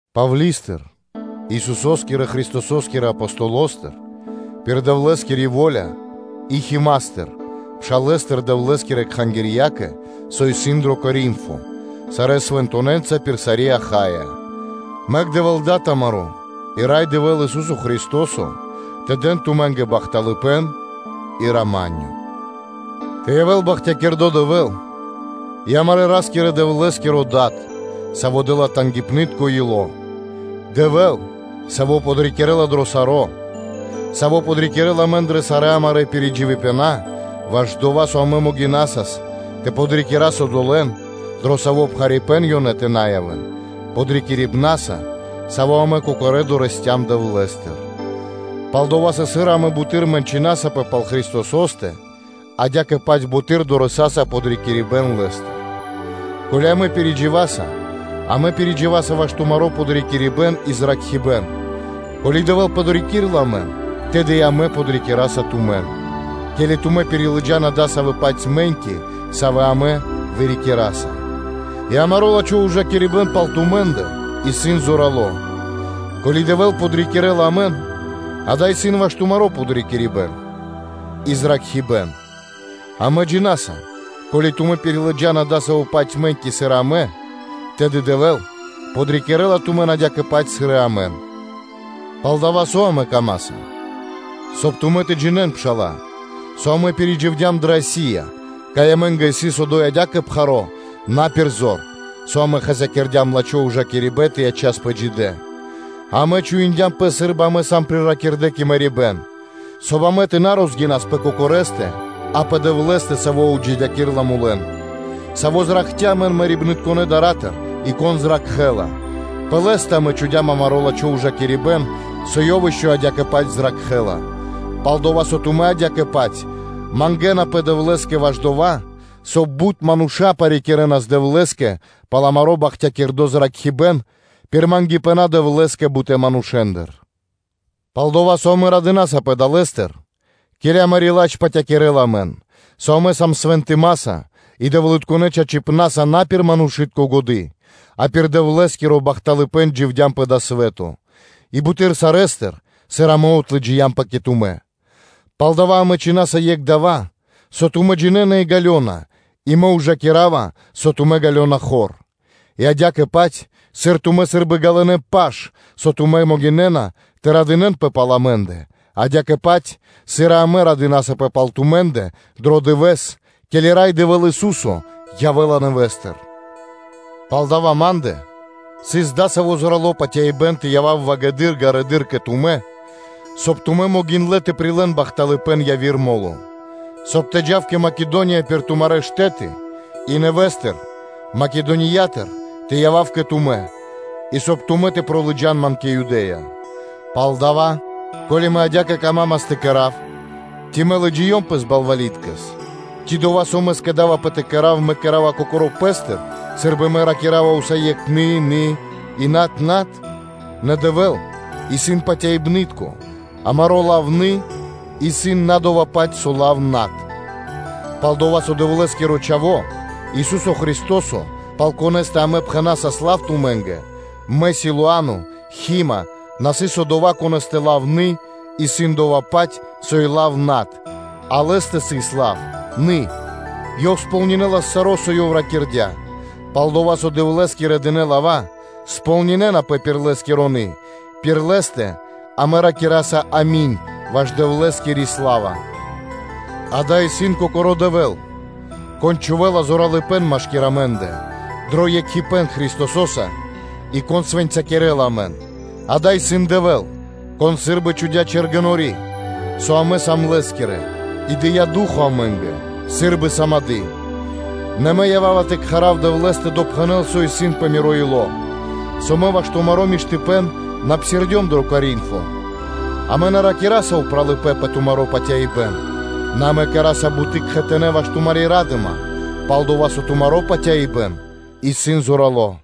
Павли́стыр, Исусо́скирэ Христосо́скирэ Апостоло́стыр пир Дэвлэ́скири во́ля, и Хима́стыр (Тимофеёстыр), пшалэ́стыр, Дэвлэ́скирэ кхангирья́кэ, со исын дро Коринфо, сарэ́ свэнтонэ́нца пир сари́ Ахая. Мэк Дэвэ́л Дад амаро́ и Рай Дэвэ́л Ису́со Христо́со тэ дэн тумэ́нгэ бахталыпэ́н и рама́нё (миро). Тэ явэ́л бахтякирдо́ Дэвэ́л и амарэ́ Ра́скирэ-Дэвлэ́скиро Дад, Саво́ дэ́ла тангипны́тко (жалосно) ило́; Дэвэ́л, Саво́ подрикирэ́ла дро саро́; Саво́ подрикирэ́ла амэн дрэ сарэ́ амарэ́ пиридживипэна ваш дова́, соб (кай) амэ могинасас тэ подрикирас одолэ́н, дро саво́ пхарипэ́н ёнэ тэ на явэ́н, подрикирибнаса, саво́ амэ кокорэ́ дорэсцям Дэвлэ́стыр: Пал-дова́ со, сыр амэ буты́р мэнчынасапэ пал Христосо́стэ, адя́кэ-паць амэ буты́р дорэсаса подрикирибэ́н Лэ́стыр. Ко́ли амэ пиридживаса, амэ пиридживаса ваш тумаро́ подрикирибэ́н и зракхибэ́н; ко́ли Дэвэ́л подрикирэ́ла амэн, тэды и амэ подрикираса тумэн, ке́ли тумэ́ пирилыджана дасавэ́-паць мэ́ньки, савэ́ амэ вырикираса, и амаро́ лачхо́ ужакирибэ́н пал тумэ́ндэ исын зорало́: ко́ли Дэвэ́л подрикирэ́ла амэн, дава́ исын ваш тумаро́ подрикирибэ́н и зракхибэ́н: амэ джина́са, ко́ли тумэ́ пирилыджана дасавэ́-паць мэ́ньки, сыр и амэ, тэды Дэвэ́л подрикирэ́ла тумэн, адя́кэ-паць сыр и амэн. Палдава́ амэ камаса, соб (кай) тумэ́ тэ джинэ́н, пшала́лэ, со амэ пиридживдям дрэ Асия, кай амэ́нгэ сыс одо́й адя́кэ пхаро́ на пир зор, со амэ хасякирдям лачхо́ ужакирибэ́н тэ ячаспэ джидэ́нца. А амэ чуиндям пэс сы́рбы амэ сам приракирдэ кэ мэрибэ́н, соб (кай) амэ тэ на розгинас пэ кокорэндэ, а пэ Дэвлэ́стэ, Саво́ отджидякирэла мулэн, Саво́ зракхця́ амэн мэрибнытконэ́ дара́тыр (дарьятыр), и Кон зракхэ́ла; пэ Лэ́стэ амэ чхудям амаро́ лачхо́ ужакирибэ́н, со Ёв ишчо (инкэ́) адя́кэ-паць зракхэ́ла; пал-дова́ со тумэ́ адя́кэ-паць мангэ́напэ Дэвлэ́скэ ваш дова́, соб (кай) бут мануша́ парикирэнас Дэвлэ́скэ пал амаро́ бахтякирдо́ зракхибэ́н пир патерья (молитвы) Дэвлэ́скэ бутэ́ манушэ́ндыр. Пал-дова́ со амэ радынасапэ далэ́стыр, ке́ли амари́ ладж патякирэла амэн, со амэ свэнтымаса и Дэвлытконэ́ чачипна́са на пир манушы́тко годы́, а пир Дэвлэ́скиро бахталыпэ́н дживдям пэ дава́ свэ́то, и буты́р сарэ́стыр, сыр амэ отлыджиямпэ кэ тумэ́. Палдава́ амэ чхинаса екх дава́, со тумэ́ джинэ́на и ґалёна; и мэ ужакирава лачхипэ́н, со тумэ́ ґалёна хор; и адя́кэ-паць, сыр тумэ́ сы́рбы ґалынэ́ паш, со тумэ́ могинэ́на тэ радынэ́нпэ пал амэ́ндэ, адя́кэ-паць, сыр и амэ радынасапэ пал тумэ́ндэ дро дывэ́с, ке́ли Рай Дэвэ́л Ису́со явэ́ла нэвэ́стыр. Палдава́ ма́ндэ сыс дасаво зорало́ патяибэ́н тэ явав ґарэдыр кэ тумэ́, соб (кай) тумэ́ могиндлэ́ тэ прилэ́н бахталыпэ́н яви́р мо́ло; соб (кай) мэ тэ джав кэ Македония пир тумарэ́ штэ́ты, и нэвэ́стыр Македониятыр тэ явав кэ тумэ́, и соб (кай) тумэ́ тэ лыджа́н ман дурэды́р кэ Юдэ́я. Палдава́, ко́ли мэ адя́кэ камамас тэ кэра́в, ци мэ лыджиём пэс балвали́ткэс? Ци дова́, со мэ скэдавпэ тэ кэра́в, мэ кэра́ва кокоро́ пэ́стыр сы́рбы мэ ракира́ва усае́кх “нэ, нэ”, и “над, над”? Нэ Дэвэ́л исын патяибны́тко, амаро́ лав “нэ”, исын на дова́-паць, со лав “над.” Пал-дова́ со Дэвлэ́скиро Чхаво́, Ису́со Христо́со, пал Конэ́стэ амэ пхэнасас лав тумэ́нгэ – мэ, Силуано, Тимофеё (Хи́ма) – на сыс Одова́, Конэ́стэ лав “нэ” исын дова́-паць, со и лав “над”; а Лэ́стэ сыс лав “нэ”: Ёв кэрэ́ла кэ ко́нцо/яго́ро (сполнинэлас) саро́, со Ёв ракирдя́. Пал-дова́ со Дэвлэ́скирэ дынэ́ лава́ сполнинэнапэ пир Лэ́скиро “нэ”, пир Лэ́стэ амэ ракираса “ами́нь” ваш Дэвлэ́скири сла́ва. Дава́ исын Кокоро́ Дэвэ́л, Кон чхувэ́ла зоралыпэ́н машки́р амэ́ндэ дро екхипэ́н Христосо́са и Кон свэнцякирэла амэн, дава́ исын Дэвэ́л, Кон сы́рбы чхудя́ чэргэнори́ (печать), со амэ сам Лэ́скирэ, и дыя́ Ду́хо (Фа́но) амэ́нгэ сы́рбы сымады́. Нэ мэ ява́ва тэ кхарав Дэвлэ́с тэ допхэнэл, со исын пэ миро ило́, со мэ ваш тумаро́ миштыпэ́н на псирдём дро Коринфо. Амэ на рикираса упралыпэ́н пэ тумаро́ патяибэ́н, нэ амэ кэра́са буты́ кхэтанэ́ ваш тумари́ ра́дыма, пал-дава́ со тумаро́ патяибэ́н исын зорало́.